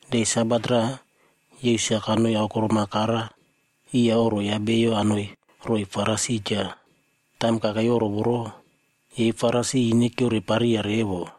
De Sabat raꞌa, Yesus-a kanoi aokorom-a kara iya oꞌro ya bio anoi roiy Farisi cha. Taim kakei oꞌro voro, yei Farisi ine kyiorepariya revo.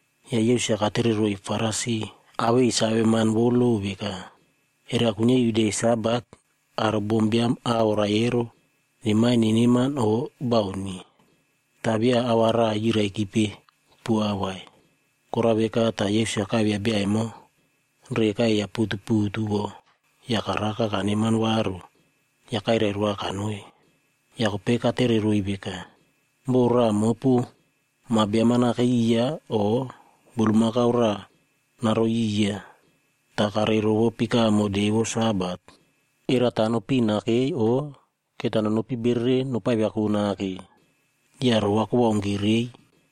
Ya Yesus-a katereroiy Farisi awei saveman vou lo veka, “Era kuinyia iu de Sabat aro bombiam a oraie nemaie neneman o bauni?” Ta via a va raꞌa yiraikipe poa vai. Korao veka ta Yesus-a kaivia bia emo reka eiya putuputu vo ya karaka kaneman varu ya kairai roa kanoi. Ya kopei katereroiy veka, “Bo raꞌa mopu ma biam-a nakei iya o bulmakau raꞌa naroi iya, ta karei rovo pikamo de vou Sabat, era ta nopin nakei o keta nonopi bereren nopaiviako nake?” Ya roꞌo kowaunki rei.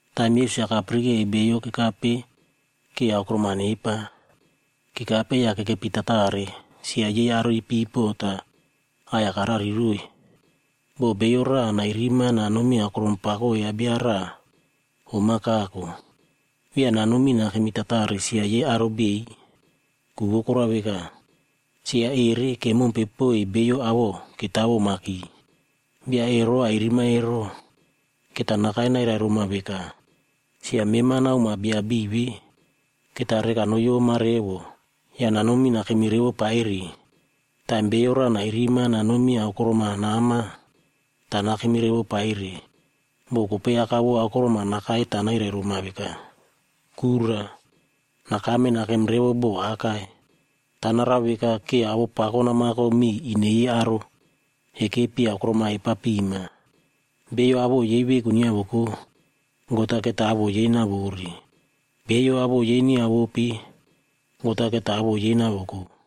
Taim Yesus-a kapirikei beiyo kekape ke aokorom-a nepa, kekape ya kekepi tatare sia yei aro ipipo ta aꞌai-ya karariroiy. “Bo bio raꞌa nairima nanomi aokorom pako ya bia raꞌa om-a kako, via nanomi nakemi tatare sia yei aro beiy. Ku vou korao veka, sia ere kemompe poiy beiyo awoꞌo ketawomaki. Bia ero airima ero, keta nakai nairai roma veka, ‘Sia mema naomoa bia beiy ve.’ Keta reka noyoma revo ya nanomi nakemi revo paire. Taim bio raꞌa nairima nanomi aokorom-a nama, ta nakemi revo paire, bo kopei aka vou aokorom-a nakai ta nairai roma veka, ‘Kura, nakame nakemom revo bo akai.’ Ta narao veka ke awoꞌo pako namako miy ine yei aro ekepi aokorom-a epa pima. Beiyo awoꞌo yei veku nyiavoko, God-a keta awoꞌo yei nawore. Beiyo awoꞌo yei nyiavope, God-a keta awoꞌo yei navoko.”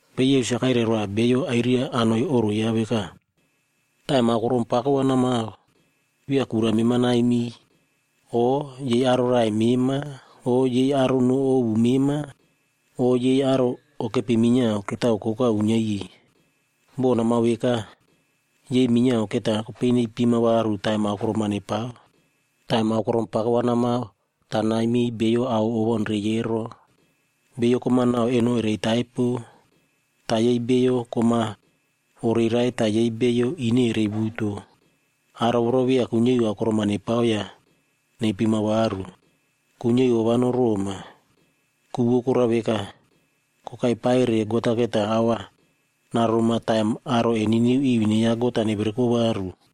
Kopei Yesus-a kairai roa bio airia anoi oꞌro yaꞌa veka, “Taim aokorom pako va namao, via kura mema naimiy, o yei aro raꞌai mema, o yei aro noꞌo ovu mema, o yei aro okepi minyiao ketao koka uinyia iꞌiy. Bo namao veka, yei minyiao keta kopei neipima varu taim aokorom-a nepao. Taim aokorom pako va namao, ta naimiy beiyo ao owaunrei ero. Beiyo kom-a nau eno erei taipo, ta yei beiyo kom-a oreirai ta yei beiyo ine erei wuto. Aro voro via kuinyia iu aokorom-a nepao ya neipima varu. Kuinyia iu ova noroꞌoma. Ku vou korao veka, kokai paire, God-a keta ao va naroma taim aro eniniu iu ine ya God-a nevereko varu.”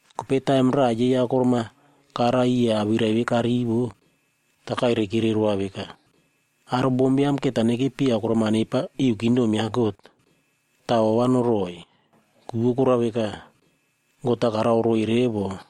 Kopei taim raꞌa yei aokorom-a kara iya awirai ve karivo, ta kairaikire roa veka, “Aro bombiam keta nekepi aokorom-a nepa iu kingdom ya God, ta ova noroꞌoi.” Ku vou korao veka, God-a karao roiy revo.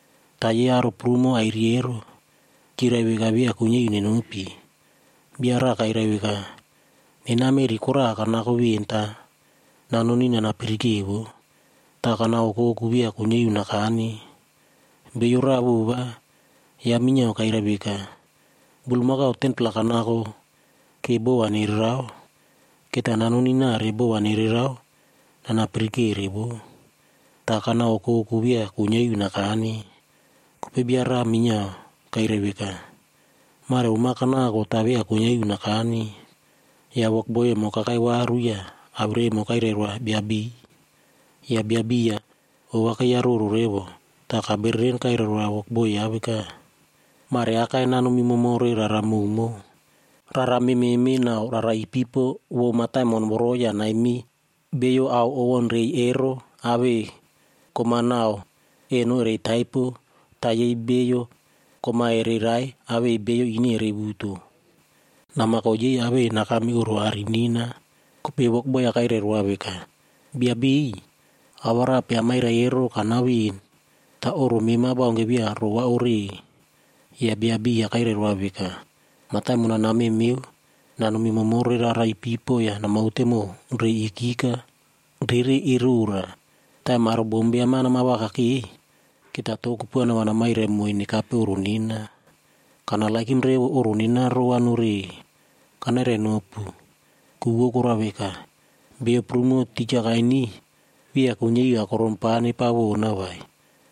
“Ta yei aro prumo airiy ero, kyirai veka via kuinyia iu nenopi. Bia raꞌa kairai veka, ‘Nena meꞌri koraꞌa kanako ven ta nanoni nana pirike voꞌo. Ta kana okoku via kuinyia iu nakane.’ “Beiyo raꞌa vova, yaꞌa minyiao kairai veka, ‘Bulmakau 10-pla kanako ke bo va nererao. Keta nanoni nare bo va nererao nana pirikere voꞌo. Ta kana okoku via kuinyia iu nakane.’ “Kopei bia raꞌa minyiao kairai veka, ‘Mare om-a kanako ta via kuinyia iu nakane.’ “Ya wokboi emo kakai varu ya awirai emo kairai roa bia beiy. Ya bia beiy-a ova keiyaroro revo ta kabereren kairai roa wokboi yaꞌa veka, ‘Mareakai nanomi momore rara mowmow. Rara mememe nau rara ipipo vou mataimon voro ya naimiy beiyo ao owaunrei ero awei beiyo kom-a nau eno erei taipo, ta yei beiyo kom-a ereirai awei beiyo ine erei wuto. Namako yei awei nakame oꞌro aꞌari nena.’ “Kopei wokboi-ya kairai roa veka, ‘Bia beiy, awarape amairai ero kanao ven ta oꞌro mema baunke via rova ore.’ “Ya bia beiy-a kairai roa veka, ‘Mataimon-a namemeo nanomi momore rara ipipo ya namaute mow reiy ikika rere erora. Taim aro bombiam-a nama vakakei, keta to kupuana va namairai moiy nekape oꞌro nena. Kanerenou revo oꞌro nena rova nore. Kanairainopu, ku vou korao veka, beiyo prumo tija kainiy, via kuinyia iu aokorom pa nepa wona vai.’”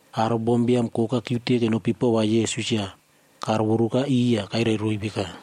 Aro bombiam koka kyiute kenopi pova Yesus ya karovoruka iꞌiy ya kairai roiy veka,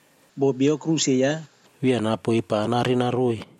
Bo bio aꞌai tiriki yaꞌa via napoi pa narenaroi,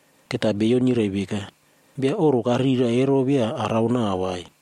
Keta beiyo nyirai veka, ‘Bia oꞌro karira ero via arao nau vai.’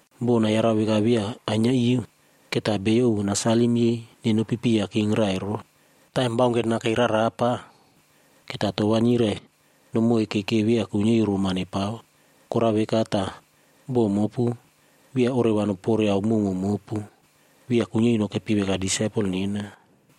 Bo nayarau veka via ainyia iu, keta beiyo ovu nasalim yei nenopipiya king rairo. Taim baunke nakei rarapa, keta to va nyirai nomoike ke via kuinyia iu roma nepao. Korao veka ta bo mopu via oreva nopore ao mowmow mopu, via kuinyia iu nokepi veka disaipel nena.”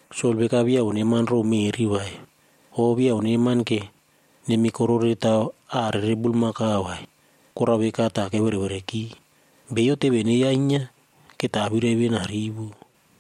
Sol veka via oneman row meꞌri vai, o via oneman ke nemi kororeu taw aꞌa rere bulmakau vai, korao veka ta keverevereki. “Beiyo teve neyainyia keta awirai ve narivo.”